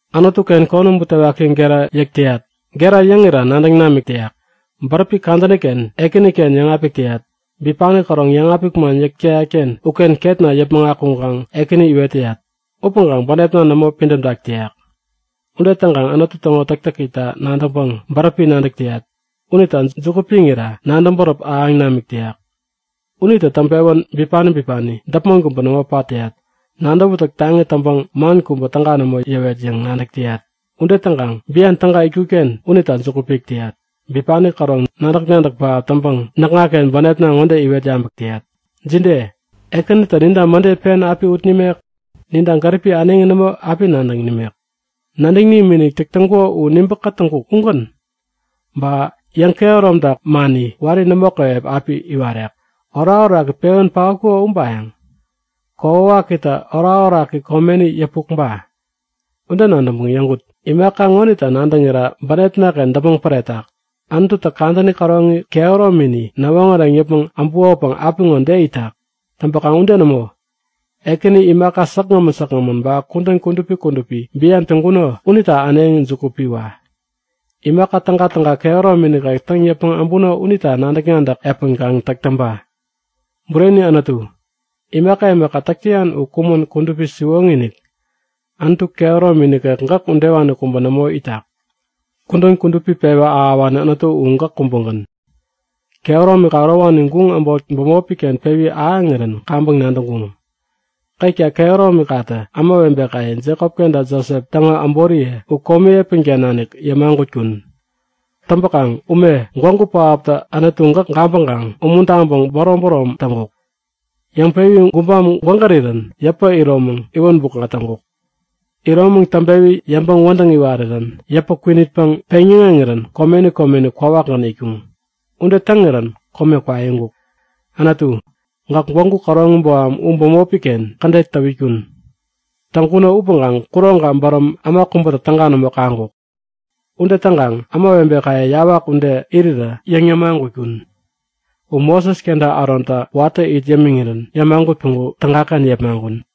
Anutuken konäm butewaki gera yäk täyat. Gera yäŋira nadäŋ namik täyak. Bäräpi kadäniken Ekäniken yäŋapik täyat. Bipani käroŋ yäŋapik man yäk täyatken uken ketna yäpmäŋ akuŋkaŋ Ekäni iwet täyat. Upäŋkaŋ bänepna nämo pidämtak täyak. Ude täŋkaŋ Anutu täŋo täktäkita nadäŋpäŋ bäräpi nadäk täyat. Unita juku piŋira nadäŋ bäräp ahäŋ namik täyak. Unitä täŋpewän bipani bipani däpmon kubä nämo pat täyat. Nadäwätäk taŋi täŋpäŋ man kubä täga nämo yäwet yäŋ nadäk täyat. Ude täŋkaŋ bian täga itkutken unita juku pik täyat. Bipani käroŋ nadäk-nadäk pähap täŋpäŋ näkŋaken bänepna ŋode iwet yabäk täyat; Jide? Ekänitä ninta mäde pen api ut nimek? Ninta gäripi äneŋi nämo api nadäŋ nimek? Nadäŋ nimikinik täk täŋkuko u nibä-katäŋkuko ugän? Ba yäŋkehäromtak mani wari nämo käwep api iwarek? Orakoraki pewän paotkuko ubayäŋ? Kokwawakitä orakoraki komeni yäpuk ba? Ude nadäŋpäŋ yäŋkut; Imaka ŋonita nadäŋira bänepnaken däpmäŋ päretak; Anututä kadäni käroŋi kehäromini näwoŋäreŋ yäpmäŋ äbukopäŋ apiŋo de itak? Täŋpäkaŋ ude nämo! Ekäni, imaka säkgämän säkgämän, ba kudän kudupi kudupi bian täŋkuno unita äneŋi juku piwa! Imaka tägatäga kehäromi nikek täŋ yäpmäŋ äbuno unita nadäk-nadäk epän kaŋ täk täŋpa! Bureni Anutu, imaka imaka täk täyan u kumän kudupi siwoŋi-inik. Anutu kehäromi nikek gäk udewani kubä nämo itak. Kudän kudupi pewä ahäwani Anutu u gäk kubägän. Kehäromika ärowani guŋ äbot bämopiken pewi ahäŋirän kaŋpäŋ nadäŋkuŋ. Ketka kehäromikatä ämawebekaye, Jekop kenta Josep täŋo äboriye u komi epänken nanik yämagutkun. Täŋpäkaŋ ume gwägu pähaptä Anutu gäk gabäŋkaŋ umuntaŋpäŋ bärom-bärom täŋkuk. Yäŋpewi gubam gwägärirän yäpä iromäŋ iwän bukŋa täŋkuk. Iromäŋ täŋpewi yäŋpäŋ-wädäŋ iwarirän yäpä kwinitpäŋ peŋyäŋeŋirän komeni komeni kwawakgän itkuŋ. Ude täŋirän kome kwaiŋkuk. Anutu, gäk gwägu käroŋi boham u bämopiken kädet täwitkun. Täŋkuno upäŋkaŋ kuroŋka bäräm äma kubätä täga nämo kaŋkuk. Ude täŋkaŋ ämawebekaye yawak ude irirä yäŋ-yämagutkun. U Moses kenta Arontä watä it yämiŋirän yämagut päŋku tägaken yepmaŋkun.